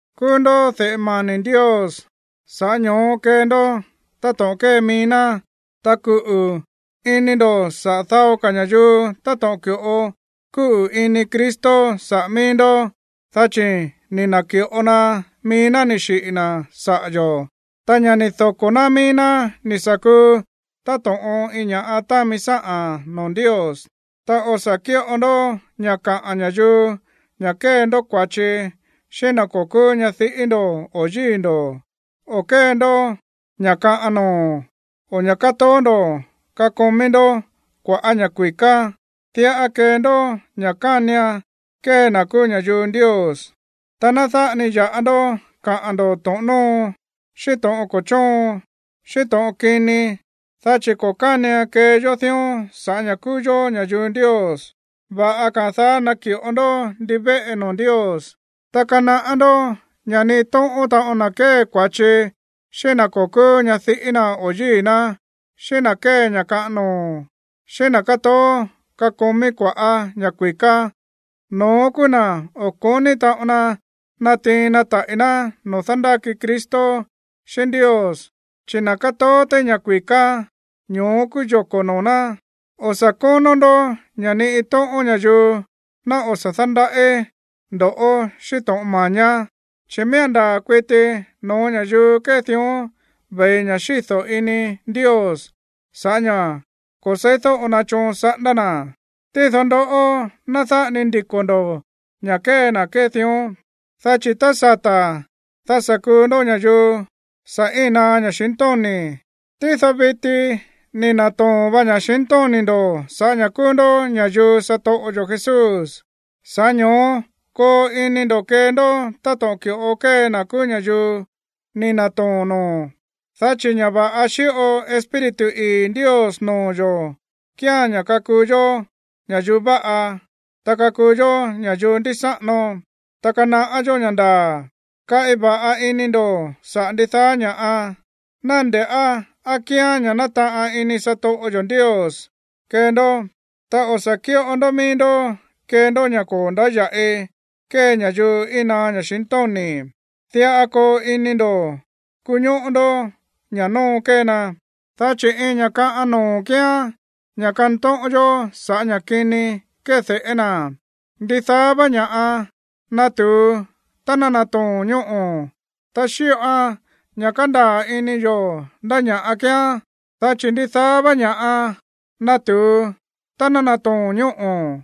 Kúú ndó de̱ꞌe mani̱ Ndios, sa̱ꞌá ño̱ó kee ndó táto̱ꞌon kée mií ná, ta kuꞌu̱ ini ndo̱ saꞌa̱ dao ka̱ ña̱yuu táto̱ꞌon ki̱ꞌo kúꞌu̱ ini Cristo saꞌa̱ míí ndó, dá chi̱ ni̱ na̱ki̱ꞌo na mií ná ni̱ xiꞌi̱ na̱ saꞌa̱ yo̱, ta ña̱ ni̱ doko̱ ná mií ná ni̱ sa̱ kuu táto̱ꞌon iin ña̱ꞌa támi sáꞌa̱n noo̱ Ndios. Ta o̱ sa̱ kíꞌo ndó ña̱ kaꞌa̱n ña̱yuu ña̱ kée ndó kua̱chi xíꞌín na̱ ko̱ kúú ñadiꞌí ndo̱ o yíi̱ ndo̱, o kée ndó ña̱ kaꞌan noo̱, o ña̱ kátoó ndo̱ kakomí ndó kua̱ꞌá ña̱ kui̱ká. Diꞌa kee ndó ña̱ kánian kee na̱ kúú ña̱yuu Ndios. Ta ná dáꞌa ni ya̱ꞌa ndó kaꞌa̱n ndo̱ to̱ꞌon nóo, xíꞌín to̱ꞌon ko̱ chóon, xíꞌín to̱ꞌon kini, dá chi̱ ko̱ kánian kee yó dión sa̱ꞌá ña̱ kúú yó ña̱yuu Ndios. Va̱ꞌa ka̱a̱n daá naki̱ꞌo ndó ndivéꞌe noo̱ Ndios. Ta kanaꞌá ndó ña̱ ni iin tóꞌón taꞌon na̱ kée kua̱chi xíꞌín na̱ ko̱ kúú ñadiꞌí na̱ o yíi̱ ná, xíꞌín na̱ kée ña̱ kaꞌan noo̱, xíꞌín na̱ kátoó kakomí kua̱ꞌá ña̱ kui̱ká, no̱ón kúú na̱ o̱ ko̱ní taꞌon na natiin na taꞌi̱ ná noo̱ dándáki Cristo xíꞌín Ndios. Chi̱ na̱ kátoó téí ña̱ kui̱ká, ño̱ó kúú yoko̱ noo̱ ná. O̱ sa̱ kónó ndó ña̱ ni iin tóꞌón ña̱yuu ná o̱ sa̱ dándaꞌí ndo̱ꞌó xíꞌín to̱ꞌon mañá, dá chi̱ miía̱n ndaa̱ kuiti noo̱ ña̱yuu kée dión ve̱i ña̱ xído̱ ini Ndios sa̱ꞌá ña̱ ko̱ se̱ídóꞌo na choon saꞌándá na̱. Tído ndoꞌó, ná dáꞌa ni ndiko̱ ndo̱ ña̱ kée na̱ kée dión. Dá chi̱ tá sata̱, dá sa̱ kuu ndó ña̱yuu sa̱ íi̱n naá ña̱xintóni̱. Tído viti ni̱ na̱too̱n va ña̱xintóni̱ ndo̱ sa̱ꞌá ña̱ kúú ndó ña̱yuu satoꞌo yo̱ Jesús. Sa̱ꞌá ño̱ó koo ini ndo̱ kee ndó táto̱ꞌon ki̱ꞌo kée na̱ kúú ña̱yuu ni̱ na̱too̱n noo̱. Dá chi̱ ña̱ va̱ꞌa xíꞌo Espíritu ii̱ Ndios noo̱ yo̱ kíán ña̱ kakuu yó ña̱yuu váꞌa, ta kakuu yó ña̱yuu ndísáꞌano, ta kanaꞌá yó ña̱ ndaa̱. Kaꞌi va̱ꞌa ini ndo̱ saꞌa̱ ndidaá ña̱ꞌa, ná nde̱ꞌá á kíán ña̱ nátaꞌan ini satoꞌo yo̱ Ndios kee ndó. Ta o̱ sa̱ kíꞌo ndó mií ndó kee ndó ña̱ ko̱ ndáya̱ꞌi kée ña̱yuu íin naá ña̱xintóni̱, diꞌa koo ini ndo̱ kuñóꞌó ndó ña̱ nóo kée na, dá chi̱ iin ña̱ kaꞌan noo̱ kíán ña̱ kantóꞌón yó sa̱ꞌá ña̱ kini kéde̱ꞌé na̱. Ndidaá vá ña̱ꞌa nátu̱u tá nátoo̱n ñóꞌo̱, ta xíꞌoan ña̱ kándaa̱ ini yo̱ ndá ña̱ꞌa kíán, dá chi̱ ndidaá vá ña̱ꞌa nátu̱u tá nátoo̱n ñóꞌo̱.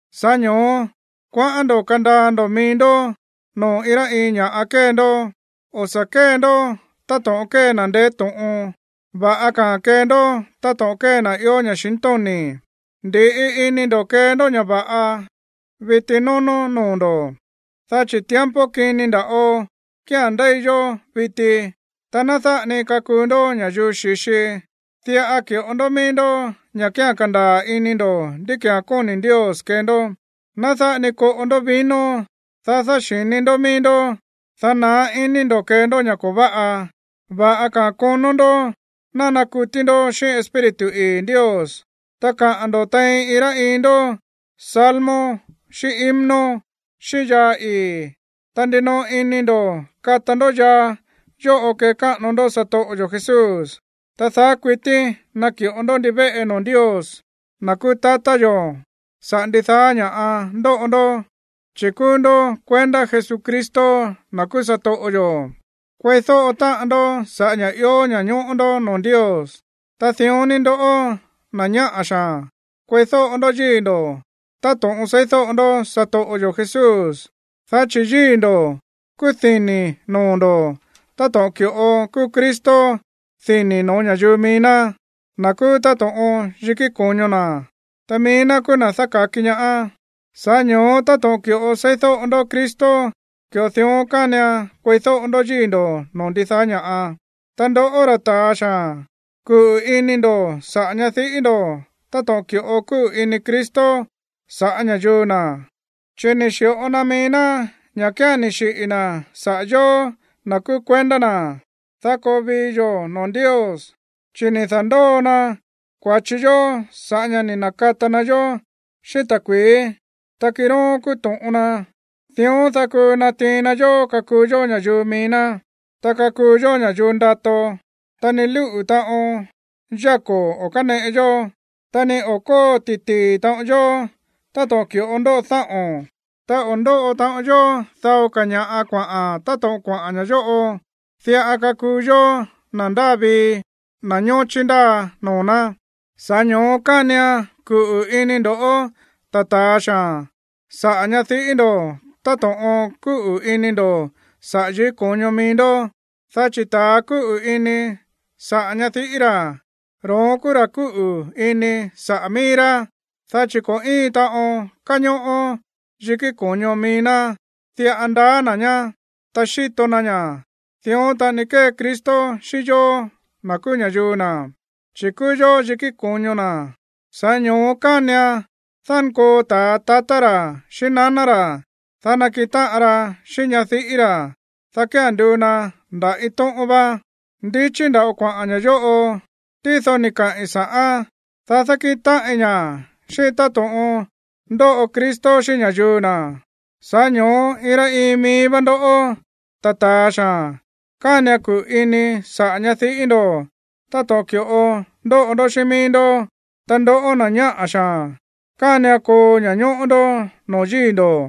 Sa̱ꞌá ño̱ó kuaꞌán ndo̱ kandaa ndo̱ mií ndó noo̱ iin rá iin ña̱ꞌa kée ndó, o̱ sa̱ kée ndó táto̱ꞌon kée na̱ ndeé to̱ꞌon, va̱ꞌa ka̱a̱n kee ndó táto̱ꞌon kée na̱ ió ña̱xintóni̱. Ndi̱ꞌi ini ndo̱ kee ndó ña̱ va̱ꞌa viti nónó noo̱ ndo̱, dá chi̱ tiempo kini nda̱ꞌo kía̱n ndéi yó viti. Ta ná dáꞌa ni kakuu ndó ña̱yuu xi̱xi, diꞌa ki̱ꞌo ndó mií ndó ña̱ kía̱n kandaa̱ ini ndo̱ ndí ki̱án kóni̱ Ndios kee ndó. Ná dáꞌa ni koꞌo ndó vino, dá dáxi̱ni ndó mií ndó, dá naá ini ndo̱ kee ndó ña̱ ko̱ váꞌa. Va̱ꞌa ka̱a̱n konó ndó ná nakutí ndó xíꞌín Espíritu ii̱ Ndios. Ta kaꞌa̱n ndo̱ tein iin rá iin ndó salmo xíꞌín himno, xíꞌín yaa ii̱. Ta ndinoꞌo ini ndo̱ kata ndó yaa yóꞌo kekáꞌano ndó satoꞌo yo̱ Jesús, ta daá kuití naki̱ꞌo ndó ndivéꞌe noo̱ Ndios, na̱ kúú tatá yo̱, sa̱ꞌá ndidaá ña̱ꞌa ndóꞌo ndó, chi̱ kúú ndó kuendá Jesucristo, na̱ kúú satoꞌo yo̱. Kueídóꞌo táꞌan ndó sa̱ꞌá ña̱ ió ña̱ñóꞌó ndó noo̱ Ndios. Ta dión ni ndoꞌó, na̱ ñáꞌa̱ xaa̱n, kueídóꞌo ndó yíi̱ ndo̱ táto̱ꞌon seídóꞌo ndó satoꞌo yo̱ Jesús. Dá chi̱ yíi̱ ndo̱ kúú dini̱ noo̱ ndo̱ táto̱ꞌon ki̱ꞌo kúú Cristo dini̱ no̱ó ña̱yuu mií ná, na̱ kúú táto̱ꞌon yikí ko̱ño na̱. Ta mií ná kúú na̱ dáka̱ki ñaá. Sa̱ꞌá ño̱ó táto̱ꞌon ki̱ꞌo seídóꞌo ndó Cristo, ki̱ꞌo dión kánian kueídóꞌo ndó yíi̱ ndo̱ noo̱ ndidaá ña̱ꞌa. Ta ndoꞌó, ra̱ ta̱a xaa̱n, kuꞌu̱ ini ndo̱ saꞌa̱ ñadiꞌí ndo̱ táto̱ꞌon ki̱ꞌo kúꞌu̱ ini Cristo saꞌa̱ ña̱yuu na̱, chi̱ ni̱ xi̱ꞌo na mií ná ña̱ kía̱n ni̱ xiꞌi̱ na̱ saꞌa̱ yóó, na̱ kúú kuendá na̱, dá koo vii yo̱ noo̱ Ndios, chi̱ ni̱ da̱ndóo na kua̱chi yó sa̱ꞌá ña̱ ni̱ na̱kata na yó xíꞌín ta̱kui̱í, ta kiróón kúú to̱ꞌon na. Dión, dá kuu natiin na yó kakuu yó ña̱yuu mií ná, ta kakuu yó ña̱yuu ndato, ta ni lúꞌu̱ taꞌon yáko̱ o̱ káneꞌe yó, ta ni o̱ kóo ti̱tii̱ taꞌon yó táto̱ꞌon ki̱ꞌo ndóꞌo dáꞌo̱n, ta o̱ ndóꞌo taꞌon yó dao ka̱ ña̱ꞌa kuaꞌa̱n táto̱ꞌon kuaꞌa̱n ña̱ yóꞌo. Diꞌa kakuu yó na̱ ndáa vii, na̱ ñóchí ndáa noo̱ ná. Sa̱ꞌá ño̱ó kánian kuꞌu̱ ini ndo̱ꞌó, ta̱ ta̱a xaa̱n, saꞌa̱ ñadiꞌí ndo̱ táto̱ꞌon kúꞌu̱ ini ndo̱ saꞌa̱ yikí ko̱ño mií ndó, dá chi̱ ta̱a kúꞌu̱ ini saꞌa̱ ñadiꞌí ra̱, ro̱ón kúú ra̱ kúꞌu̱ ini saꞌa̱ mií rá. Dá chi̱ ko̱ íin taꞌon káñóꞌó yikí ko̱ño mií ná. Diꞌa ndaá na̱ ñá, ta xíto na ña̱. Dión taꞌani kée Cristo xíꞌín yó, na̱ kúú ña̱yuu na̱, chi̱ kúú yó yikí ko̱ño na̱. Sa̱ꞌá ño̱ó kánian dánkoo ta̱a tatá ra̱ xíꞌín naná ra̱, dá nakiꞌin táꞌan ra xíꞌín ñadiꞌí ra̱, dá kía̱n nduu na nda̱ iin tóꞌón vá. Ndichí nda̱ꞌo kuaꞌa̱n ña̱ yóꞌo, tído ni̱ kaꞌi̱n sa̱ꞌán, dá dákíꞌin táꞌin ña̱ xíꞌín táto̱ꞌon ndóꞌo Cristo xíꞌín ña̱yuu na̱. Sa̱ꞌá ño̱ó iin rá iin mií vá ndó, ta̱ ta̱a xaa̱n, kánian kuꞌu̱ ini saꞌa̱ ñadiꞌí ndo̱ táto̱ꞌon ki̱ꞌo ndóꞌo ndó xíꞌín mií ndó. Ta ndoꞌó, na̱ ñáꞌa̱ xaa̱n, kánian koo ña̱ñóꞌó ndó noo̱ yíi̱ ndo̱.